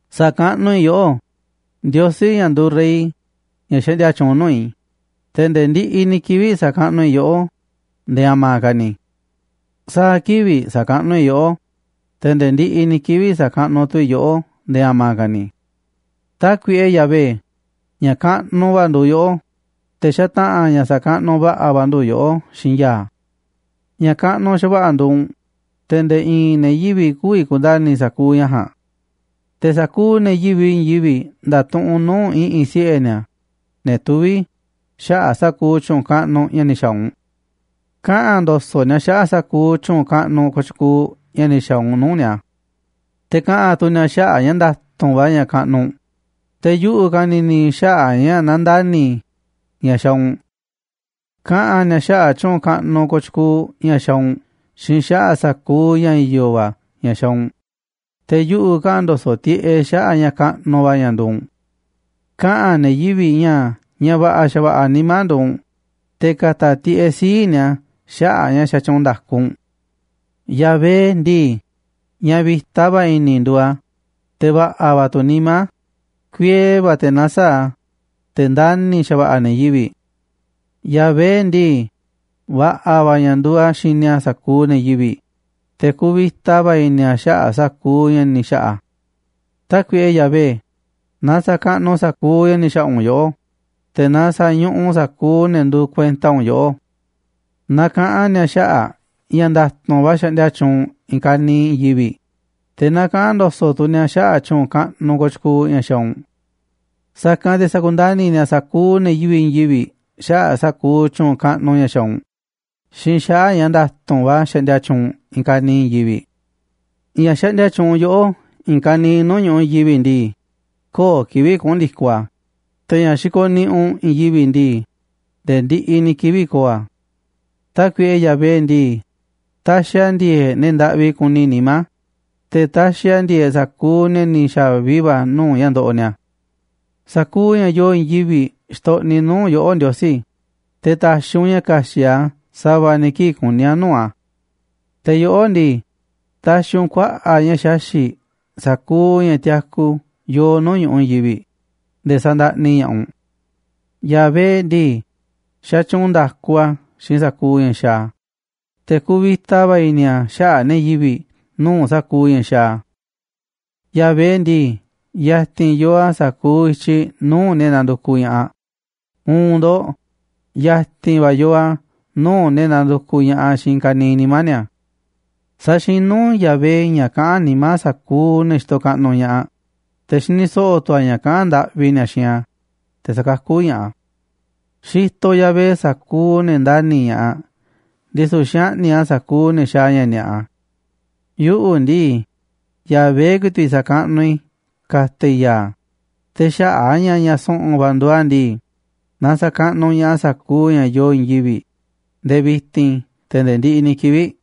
Sa̱kaꞌnuꞌ i̱ yoꞌó, Ndiosí, ña̱ nduuꞌ rey, ña̱ xaꞌndia tyuunꞌ nuu̱ꞌ i̱, te̱ nde̱e̱ ndiꞌiꞌ ni̱ kivi̱ꞌ sa̱kaꞌnuꞌ i̱ yoꞌó nde̱e̱ a̱ma̱ ka̱ ni̱. Sa̱a̱ kivi̱ꞌ sa̱kaꞌnuꞌ i̱ yoꞌó, te̱ nde̱e̱ ndiꞌiꞌ ni̱ kivi̱ꞌ sa̱kaꞌnuꞌ tu̱ i̱ yoꞌó nde̱e̱ a̱ma̱ ka̱ ni̱. Tákuiꞌe Yahvé, ña̱ kaꞌnuꞌ va̱ nduuꞌ yoꞌó, te̱ xataꞌa̱n ña̱ sa̱kaꞌnuꞌ va̱ꞌa̱ va̱ ndu̱ yoꞌó xiinꞌ ya̱a̱. Ña̱ kaꞌnuꞌ xa̱va̱ꞌa̱ nduuꞌ u̱nꞌ, te̱ nde̱e̱ i̱i̱n ne̱ yivi̱ꞌ kü̱vi̱ ku̱nda̱ni̱ sa̱kuuꞌ ña̱ ja̱a̱nꞌ. Te̱ sa̱kuuꞌ ne̱ yivi̱ꞌ i̱i̱n yivi̱ꞌ nda̱tuꞌunꞌ nuu̱ꞌ i̱ꞌi̱n siꞌe̱ ni̱a̱, ne̱ tuví, xaꞌa̱ꞌ sa̱kuuꞌ tyu̱u̱n kaꞌnuꞌ ña̱ ni̱ xa̱a̱ u̱nꞌ. Kaꞌa̱n ndo̱so̱ꞌ ni̱a̱ xaꞌa̱ꞌ sa̱kuuꞌ tyu̱u̱n kaꞌnuꞌ kooꞌ tyukuuꞌ ña̱ ni̱ xa̱a̱ u̱nꞌ nuu̱ꞌ ni̱a̱. Te̱ kaꞌa̱n tu̱ ni̱a̱ xaꞌa̱ꞌ ña̱ nda̱tu̱nꞌ va̱ ña̱ kaꞌnuꞌ u̱nꞌ, te̱ yuꞌu̱ ka̱ni̱ni̱ xaꞌa̱ꞌ ña̱ nandani̱ ña̱ xaaꞌ u̱nꞌ. Kaꞌa̱n ni̱a̱ xaꞌa̱ꞌ tyu̱u̱n kaꞌnuꞌ kooꞌ tyukuuꞌ ña̱ xaaꞌ u̱nꞌ xiinꞌ xaꞌa̱ꞌ sa̱kuuꞌ ña̱ i̱yo̱ va̱ ña̱ xaaꞌ u̱nꞌ, te̱ yuꞌu̱ kaꞌa̱n ndo̱so̱ꞌ tiꞌeꞌ xaꞌa̱ꞌ ña̱ kaꞌnuꞌ va̱ ña̱ nduuꞌ u̱nꞌ. Kaꞌa̱n ne̱ yivi̱ꞌ ña̱ ña̱ va̱ꞌa̱ xa̱va̱ꞌa̱ nimá nduuꞌ u̱nꞌ, te̱ ka̱ta̱ tiꞌeꞌ sii̱ꞌ ni̱a̱ xaꞌa̱ꞌ ña̱ xatyuunꞌ nda̱ku u̱nꞌ. Yahvé ndii, ña̱ vi̱ta va̱ i̱ni̱ nduuꞌ a̱, te̱ va̱ꞌa̱ va̱ tu̱ nimá a̱, kuiee va̱ te̱ nasaáꞌ a̱, te̱ ndani̱ xa̱va̱ꞌa̱ a̱ ne̱ yivi̱ꞌ. Yahvé ndii, va̱ꞌa̱ va̱ ña̱ nduuꞌ a̱ xini a̱ sa̱kuuꞌ ne̱ yivi̱ꞌ, te̱ kuvita va̱ i̱ni̱ a̱ xaꞌa̱ꞌ sa̱kuuꞌ ña̱ ni̱ xa̱ꞌa̱ a̱. Tákuiꞌe Yahvé, naaꞌ sa̱kaꞌnuꞌ sa̱kuuꞌ ña̱ ni̱ xa̱ꞌa̱ u̱nꞌ yoꞌó, te̱ na sa̱ñuꞌuꞌ sa̱kuuꞌ ne̱ nduuꞌ kuenta u̱nꞌ yoꞌó. Na kaꞌa̱n ni̱a̱ xaꞌa̱ꞌ ña̱ nda̱tu̱nꞌ va̱ xaꞌndia tyuunꞌ i̱i̱n ka̱niiꞌ i̱i̱n yivi̱ꞌ, te̱ na kaꞌa̱n ndo̱so̱ꞌ tu̱ ni̱a̱ xaꞌa̱ꞌ tyu̱u̱n kaꞌnuꞌ kooꞌ tyukuuꞌ ña̱ xaaꞌ u̱nꞌ. Sa̱kanꞌ te̱ sa̱kundani̱ ni̱a̱ sa̱kuuꞌ ne̱ yivi̱ꞌ i̱i̱n yivi̱ꞌ xaꞌa̱ꞌ sa̱kuuꞌ tyu̱u̱n kaꞌnuꞌ ña̱ xaaꞌ u̱nꞌ xiinꞌ xaꞌa̱ꞌ ña̱ nda̱tu̱nꞌ va̱ xaꞌndia tyuunꞌ u̱nꞌ i̱i̱n ka̱niiꞌ i̱i̱n yivi̱ꞌ. Ña̱ xaꞌndia tyuunꞌ yoꞌó i̱i̱n ka̱niiꞌ nuu̱ꞌ ñuꞌuꞌ i̱i̱n yivi̱ꞌ ndii, kö̱o̱ kivi̱ꞌ kuꞌu̱n ndi̱koꞌ a̱, te̱ ña̱ xikoꞌ niꞌiꞌ u̱nꞌ i̱i̱n yivi̱ꞌ ndii, nde̱e̱ ndiꞌiꞌ ni̱ kivi̱ꞌ ko̱o̱ a̱. Tákuiꞌe Yahvé ndii, taxiꞌ a̱ ndi̱e̱e̱ꞌ ne̱ ndaꞌvi kuni nimá, te̱ taxiꞌ a̱ ndi̱e̱e̱ꞌ sa̱kuuꞌ ne̱ ni̱ xa̱vi va̱ nuu̱ꞌ ña̱ ndoꞌoꞌ ni̱a̱. Sa̱kuuꞌ ña̱ yoo i̱i̱n yivi̱ꞌ xtoꞌniꞌ nuu̱ꞌ yoꞌó, Ndiosí, te̱ ta̱xi̱ u̱nꞌ ña̱ ka̱xi̱ꞌ a̱ sa̱va̱ ni̱ kii̱ꞌ kuní a̱ nuu̱ꞌ a̱. Te̱ yoꞌó ndii, taxiꞌ u̱nꞌ kuaꞌa̱ꞌ ña̱ xaxi̱ꞌ sa̱kuuꞌ ña̱ tiaku yoo nuu̱ꞌ ñu̱ꞌuꞌ i̱i̱n yivi̱ꞌ nde̱e̱ sa̱ndaꞌni ña̱ꞌaꞌ u̱nꞌ. Yahvé ndii, xatyuunꞌ nda̱ku a̱ xiinꞌ sa̱kuuꞌ ña̱ xaaꞌ a̱, te̱ kuuꞌ vi̱ta va̱ i̱ni̱ a̱ xaꞌa̱ꞌ ne̱ yivi̱ꞌ nuu̱ꞌ sa̱kuuꞌ ña̱ xaaꞌ a̱. Yahvé ndii, ya̱ti̱n yoo a̱ sa̱kuuꞌ i̱tyiꞌ nuu̱ꞌ ne̱ nandukuꞌ ña̱ꞌaꞌ, uun ndo̱ꞌ, ya̱ti̱n va̱ yoo a̱ nuu̱ꞌ ne̱ nandukuꞌ ña̱ꞌaꞌ xiinꞌ i̱i̱n ka̱niiꞌ nimá ni̱a̱. Saxinú Yahvé ña̱ kaꞌán nimá sa̱kuuꞌ ne̱ xitoꞌ kaꞌnuꞌ ña̱ꞌaꞌ, te̱ xini so̱ꞌo̱ tu̱ a̱ ña̱ kaꞌán ndaꞌvi ni̱a̱ xiinꞌ a̱, te̱ sakakú ña̱ꞌaꞌ a̱. Xitoꞌ Yahvé sa̱kuuꞌ ne̱ ndani̱ ña̱ꞌaꞌ, ndisu̱ xaꞌni̱ꞌ a̱ sa̱kuuꞌ ne̱ xaaꞌ ña̱ ni̱a̱ꞌa. Yuꞌu̱ ndii, Yahvé ku̱i̱ti̱ꞌ sa̱kaꞌnuꞌ i̱, ka̱ta̱ i̱ ya̱a̱, te̱ xaꞌa̱ꞌ a̱ ña̱ ña̱ su̱ꞌu̱n va̱ nduuꞌ a̱ ndii, na sa̱kaꞌnuꞌ ña̱ꞌaꞌ sa̱kuuꞌ ña̱ yoo i̱i̱n yivi̱ꞌ nde̱e̱ vi̱ti̱n, te̱ nde̱e̱ ndiꞌiꞌ ni̱ kivi̱ꞌ.